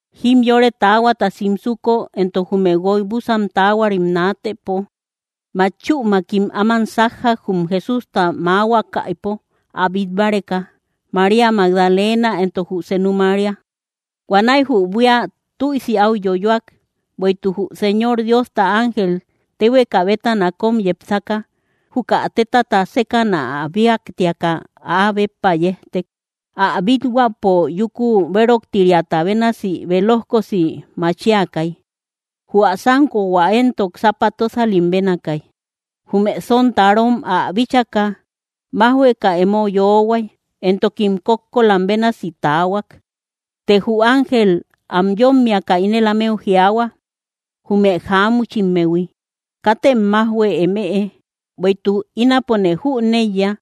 Jimyore taahuata simsuko, entok jume guoy búsan taahuarim naatëpo, matchümakim áman sájjak, jum Jesústa maahuakäipo ä bít báreka, María Magdalena entok jü senu María. Huanäi jü buía tüisi áu yoyoak, bueïtuk jü Señor Diosta ángel, téhueka bétana kóm yepsaka, juka tétata sékäna ä bíaktiaka, áa béppa yejtek. Ä bíthuäpo yúku béroktiriata bénasi bélojkosi machiakay. Jü ä sánkohua éntok sápa tósalim bénaakay. Jume sontarom ä bíchaka májhueka emo yoohuay, entokim kókkolam bénasi taahuak. Të jü ángel am yómmiaka ínel ámeu jiaahua, jume jáamuchimmehui: —Katem májhue emëe, bueïtuk ínapone jüneiya,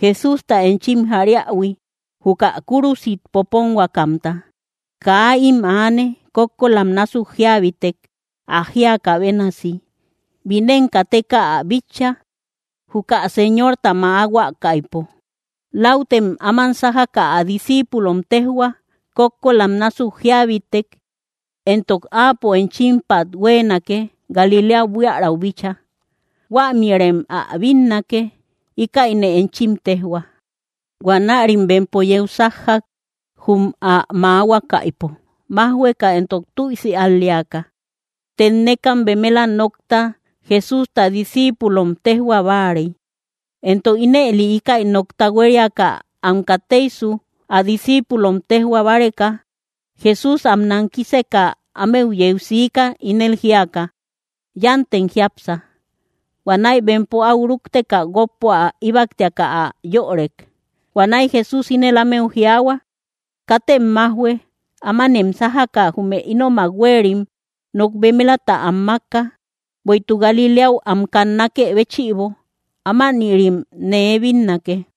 Jesústa enchim jariähui, juka kúrusit poponhuakamta. Kaa ím aane; kókkolam násuk jíabitek, ä jíakä bénasi. Binen kateka ä bitcha, juka Señorta mäahuakäipo. Läutem áman sájaka ä discíipulom téjhua: “Kókkolam násuk jíabitek, entok Áapo enchimpat huéenake Galiléau buiaräu bíchaa. Huämïrem ä bínnake.” Íkäine enchim téjhua. Huanärim bempo yeu sájjak, jum ä mäahuakäipo, májhueka entok tüisi al‑leaka. Tennekam bemela nokta Jesústa discíipulom téjhua báarey, entok ínëli íkäi nokta huériaka am kateisu ä discíipulom téjhua báreka, Jesús am nankiseka ámeu yeu siika, ínel jíaka: —¡Yántem jiápsa! Huanäi bempo áu rúkteka guókpo ä íbaktiaka, ä yörek. Huanäi Jesús ínel ámeu jiaahua: —¡Katem májhue! Ámanem sájaka jume ínomak huéerim nok bemelata am mákka, bueïtuk Galiléau am kannakë béchïbo. Ámanïrim nee bínnake.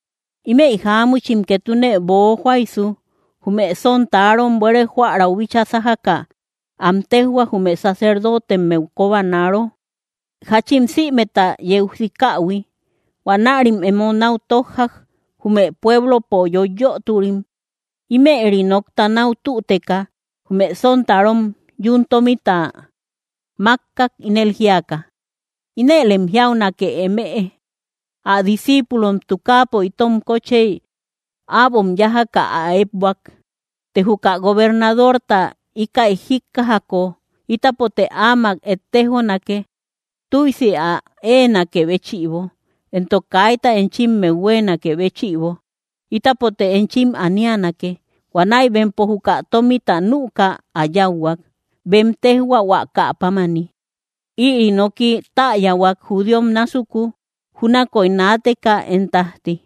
Ímëi jáamuchim ketune boojoaïsu, jume sontarom buére jóärau bíchaa sájaka, am téjhuak, jume sacerdotemmeu kobanaro, jáchin sïmeta yeu sikähui. Huanärim emo náu tójjak, jume pueblopo yöiyoturim. Ímëri nokta náu tüteka, jume sontarom yún tómita mákkak, ínel jíaka: —Inëlem jiaunake emëe: “Ä discíipulom tukaapo itom kóchey äbom yájaka ä ékbuak.” Të juka gobernadorta íkäi jíkkajako, ítapote áamak ettejonake, tüisi ä éenakë béchïbo; entok kaita enchimmeu huéenakë béchïbo, ítapote enchim anianake. Huanäi bempo juka tómita nüka ä yáuhuak, bem téjhuahuakä pámani. Ïri noki täyahuak judíom násuku, júnakoy naateka én tájti.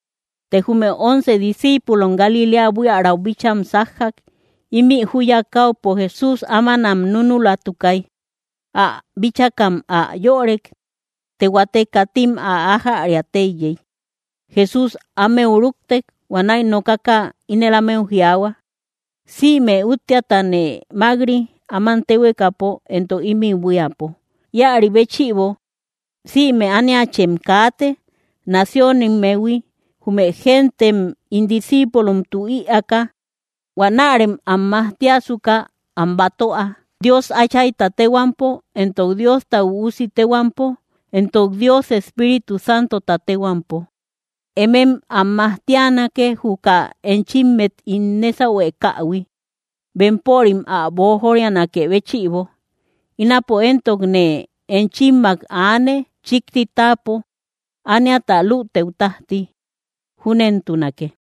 Të jume once discíipulom, Galiléa buiaräu bícham sájjak. Ímï júya káupo Jesús ámanam núnulatukay. Ä bíchakam ä yorek; të huate katim ä ajäria teiyey. Jesús ámeu ruktek, huanäi nokaka ínel ámeu jiaahua: —Sïme úttiatane mák‑ri, áman téhuekapo entok ímï buíapo. Íäri béchïbo, sïme ániachem kaate, naciónimmehui, jume gentem ín discíipulomtu ïaaka. Huanärem am majtiasuka am batöa, Dios Áchayta téhuampo, entok Diosta Üusi téhuampo, entok Dios Espíritu Santota téhuampo. Emem am majtianake, juka enchimmet ín nésahuekähui, bempörim ä boojorianakë béchïbo. Ínapo éntok nee enchimmak aane, chíkti táapo, ániata lütëu tájti. Júnentunake.